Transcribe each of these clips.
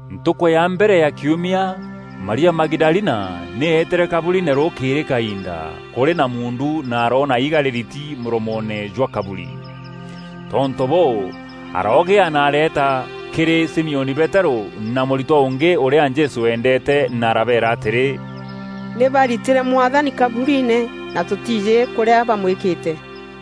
Ntukû ya mbere ya kiumia, Maria Magidalina nî eetîre kaburiine rûkîîrî kaiinda, kûrî na muundu na aroona iiga rîriti mûromoone jwa kaburi. Tontû bûû, aroogîa na areeta kîrî Simioni Peterû na mûritwa ûngî ûrîa Jesû eendeete na arabeera atîrî, “Nî baritîre Mwathani kaburiine, na tûtiijî kûrîa bamwîkîte.”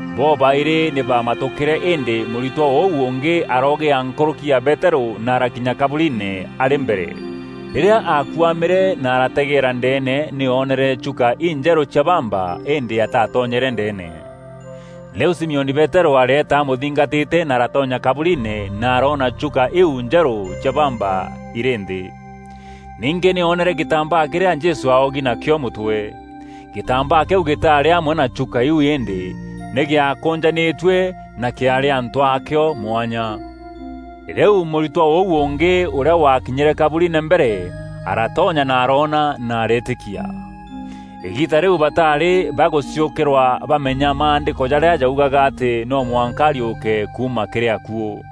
Bobaîrî nî baamatûkîre îndî mûritwa ûu ûngî aroogîa nkûrûki ya Peterû na arakinya kaburiine arî mbere. Rîrîa aakuamîre na arategeera ndeene nî oonere chuka injerû cia bamba îndî atatonyere ndeene. Rîu Simioni Peterû areeta amûthingatîte na aratonya kaburiine na aroona chuka iu njerû cia bamba irî nthî. Ningî nî oonere gîtambaa kîrîa Jesû aaogi nakîo mûtwe. Gîtambaa kîu gîtaarî amwe na chuka iu îndî nî gîaakûnjanîtue na kîaarî antû aakîo mwanya. Rîu mûritwa ûu ûngî ûrîa wakinyîre kaburiine mbere aratonya na aroona na areetîkia. Îgiita rîu bataarî bagûciûkîrwa bamenya Maandîko jarîa jaugaga atî no mwanka ariûke kuuma kîrî akuû.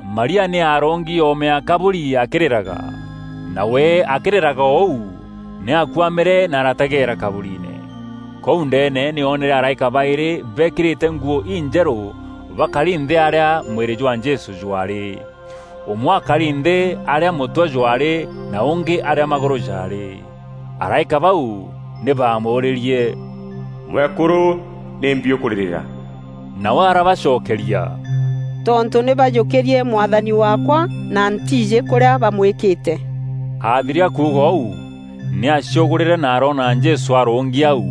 Maria nî aarûngi oome ya kaburi akîrîraga. Nawe akîrîraga o ûu, nî akuamîre na arategeera kaburiine. Kûu ndeene nî oonere araîka baîrî beekîrîte nguû injerû bakari nthî arîa mwîrî jwa Jesû jwaarî: ûmwe aakari nthî arîa mûtwe jwaarî na ûngî arîa magûrû jaarî. Araîka bau nî baamûûrîrie, “Mwekûrû, nîmbi ûkûrîrîra?” Nawe arabacokeria, “Tontû nî bajûkîrie Mwathani waakwa na ntiijî kûrîa bamwîkîte.” Athiria kuuga ûu, nî aaciûgûrîre na aroona Jesû arûngi au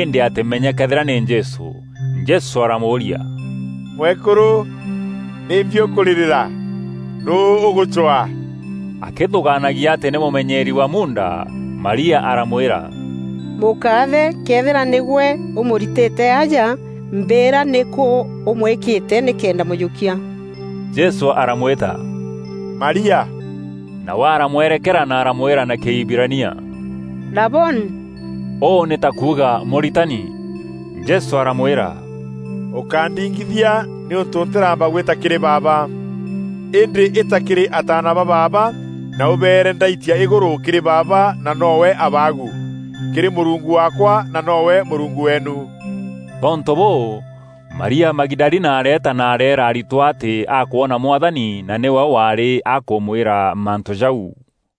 îndî atîmenye këethîra nî Jesû. Jesû aaramûûria, “Mwekûrû, nîmbi ûkûrîrîra? Nûû ûgûcwaa?” Akîthûgaanagia atî nî mûmenyeeri wa muunda, Maria aramwîra, “Mûkaathe, këethîra nîgwe ûmûritîte aja, mbîîra nîkû ûmwîkîte, nîkenda mûjûkia.” Jesû aramwîta, “Maria.” Nawe aramwerekera na aramwîra na Kîhibirania, “Raboni.” Ûu nî ta kuuga Mûritani. Jesû aramwîra, “Ûkándingithia nîûntû ntîraamba gwitia kîrî Baaba. Îndî îta kîrî ataana ba baaba na ûbeere ndaitia îgûrû kîrî Baaba na noowe Abaagu, kîrî Mûrungu waakwa na noowe Mûrungu weenu.” Tontû bûû, Maria Magidalina areeta na areera aritwa atî akwona Mwathani na nîwe waarî akûmwîra mantû jau.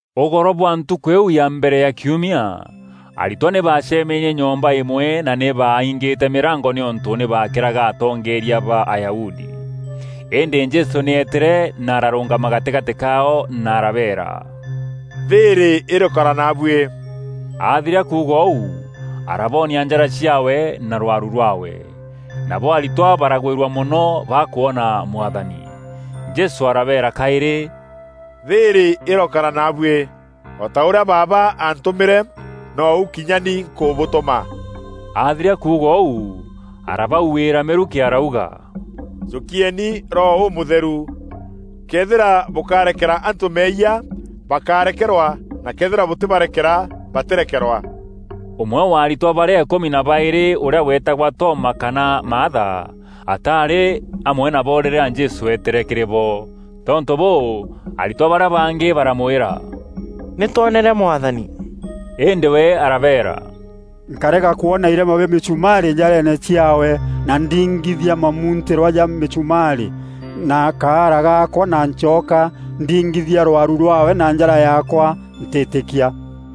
Ûgoro bwa ntûkû îîu ya mbere ya kiumia, aritwa nî baacemenie nyomba îmwe na nî baaingîte mîrango nîûntû nî baakîraga atongeeria ba Ayahudi. Îndî Jesû nî eetîre na ararûngama gatîgatî kaao na arabeera, “Thîîrî îrokara naabuî.” Athiria kuuga ûu, araboonia njara ciaawe na rwaru rwaawe. Nabo aritwa baragwîrua mono bakwona Mwathani. Jesû arabeera kaîrî, “Thîîrî îrokara naabuî. O ta ûrîa Baaba aantûmîre nou kinya ni nkûbûtûma.” Athiria kuuga ûu, arabauîîra mîrukî arauga, “Jûkieni Roho Ûmûtheru. Këethîra bûkarekera antû meeyia, bakarekerwa na këethîra bûtîbarekera batîrekerwa.” Ûmwe wa aritwa barîa îkûmi na baîrî ûrîa weetagwa Toma kana Maatha, ataarî amwe nabo rîrîa Jesû eetîre kîrî bo. Tontû bûû, aritwa barîa bangî baramwîra, “Nî twonere Mwathani.” Îndî we arabeera, “Nkarega kwona irema bia mîchumaarî njareene ciaawe na ndingithia mamuntîrwa ja mîchumaarî na kaara gaakwa na ncoka ndingithia rwaru rwaawe na njara yaakwa, ntîtîkia.”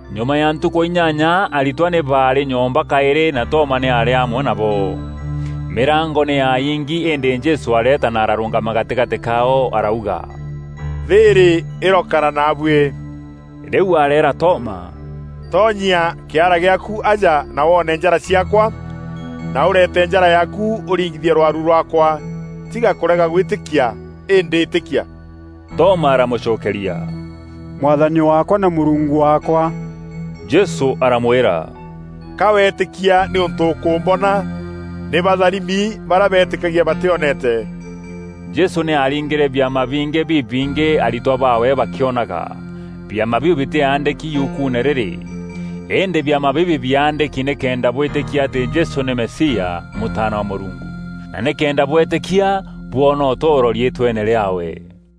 Nyuma ya ntukû inyanya aritwa nî baarî nyomba kaîrî na Toma nî aarî amwe nabo. Mîrango nî yaingi îndî Jesû areeta na ararûngama gatîgatî kaao arauga, “Thîîrî îrokara naabuî.” Rîu areera Toma, “Toonyia kîara gîaaku aja na woone njara ciaakwa na ûreete njara yaaku ûringithie rwaru rwaakwa. Tiga kûrega gwîtîkia îndî îtîkia.” Toma aramûcokeria, “Mwathani waakwa na Mûrungu waakwa!” Jesû aramwîra, “Ka weetîkia nîûntû ûkûmbona? Nî batharimi barîa beetîkagia batîoneete.” Jesû nî aaringîre biama bingî bibingî aritwa baawe bakîonaga. Biama biu bitîaandîki yukuune rîrî. Îndî biama bibi biaandîki nîkenda bwîtîkia atî Jesû nî Mesia, Mûtaana wa Mûrungu na nîkenda bweetîkia bwoona ûtûûro riîtweene rîaawe.